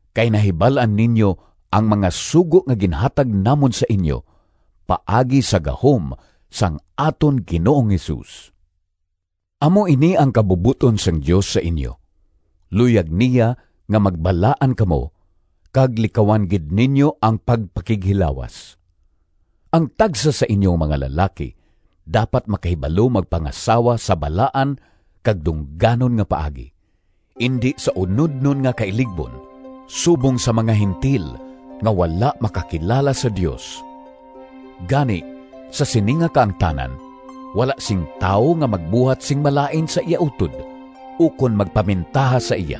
Kay nahibal-an ninyo ang mga sugo nga ginhatag namon sa inyo, paagi sa gahom sang aton Ginoong Jesus. Amo ini ang kabubot-on sang Dios sa inyo: luyag niya nga magbalaan kamo, kag likawan gid ninyo ang pagpakighilawas. Ang tagsa sa inyo nga mga lalaki dapat makahibalo magpangasawa sa balaan kag dungganon nga paagi, indi sa unodnon nga kailigbon, subong sa mga Gentil nga wala makakilala sa Dios. Gani, sa sini nga kaangtanan, wala sing tawo nga magbuhat sing malain sa iya utod ukon magpamintaha sa iya.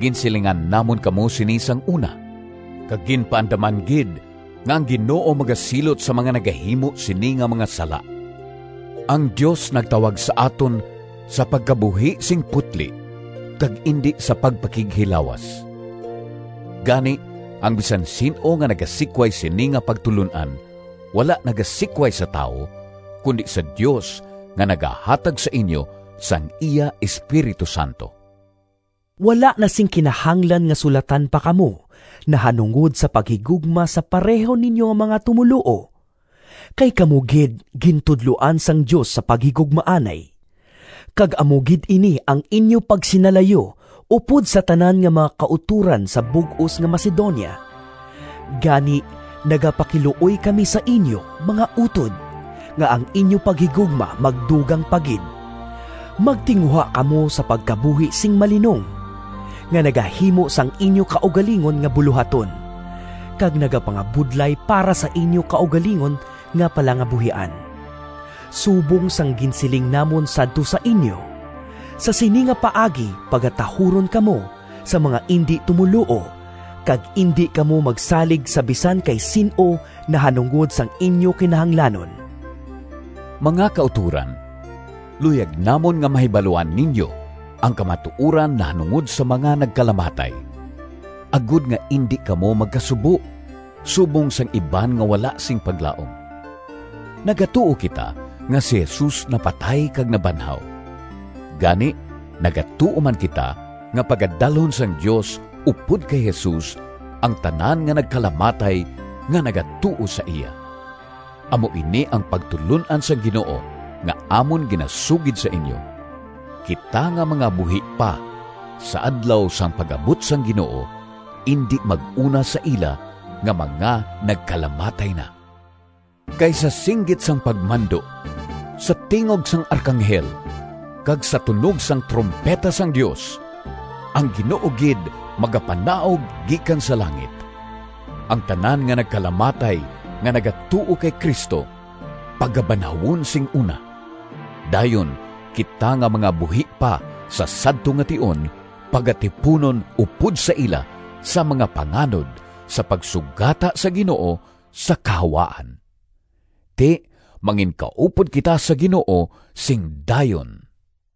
Ginsilingan namon kamo sini sang una, kag ginpaandaman gid nga ang Ginoo magasilot sa mga nagahimo sini nga mga sala. Ang Dios nagtawag sa aton sa pagkabuhi sing putli kag indi sa pagpakighilawas. Gani ang bisan sin-o nga nagasikway sini nga pagtulon-an wala nagasikway sa tawo, kundi sa Dios nga nagahatag sa inyo sang iya Espiritu Santo. Wala na sing kinahanglan nga sulatan pa kamo nahanungod sa paghigugma sa pareho ninyo nga mga tumoluo. Kay kamo gid gintudloan sang Dios sa paghigugmaanay. Kag amo gid ini ang inyo pagsinalayo upod sa tanan nga mga kautoran sa bug-os nga Macedonia. Gani nagapakiluoy kami sa inyo, mga utod, nga ang inyo paghigugma magdugang pa gid. Magtinguha kamo sa pagkabuhi sing malinong, nga nagahimo sang inyo kaugalingon nga bulohaton, kag nagapangabudlay para sa inyo kaugalingon nga palangabuhian, subong sang ginsiling namon sadto sa inyo. Sa sini nga paagi pagatahuron kamo sang mga indi tumoluo, kag indi kamo magsalig sa bisan kay sin-o nahanungod sang inyo kinahanglanon. Mga kautoran, luyag namon nga mahibaluan ninyo ang kamatuoran nahanungod sa mga nagkalamatay, agod nga indi kamo magkasubo subong sang iban nga wala sing paglaom. Nagatuo kita nga si Jesus napatay kag nabanhaw. Gani nagatuo man kita nga pagadalhon sang Dios upod kay Jesus ang tanan nga nagkalamatay nga nagatuo sa iya. Amo ini ang pagtulon-an sang Ginoo nga amon ginasugid sa inyo: kita nga mga buhi pa sa adlaw sang pag-abot sang Ginoo, indi mag-una sa ila nga mga nagkalamatay na. Kay sa singgit sang pagmando, sa tingog sang arkanghel kag sa tunog sang trumpeta sang Dios, ang Ginoo gid magapanaog gikan sa langit. Ang tanan nga nagkalamatay nga nagatuo kay Cristo pagabanhawon sing una. Dayon kita nga mga buhi pa sa sadto nga tion pagatipunon upod sa ila sa mga panganod sa pagsugata sa Ginoo sa kahawaan. Ti, manginkaupod kita sa Ginoo sing dayon.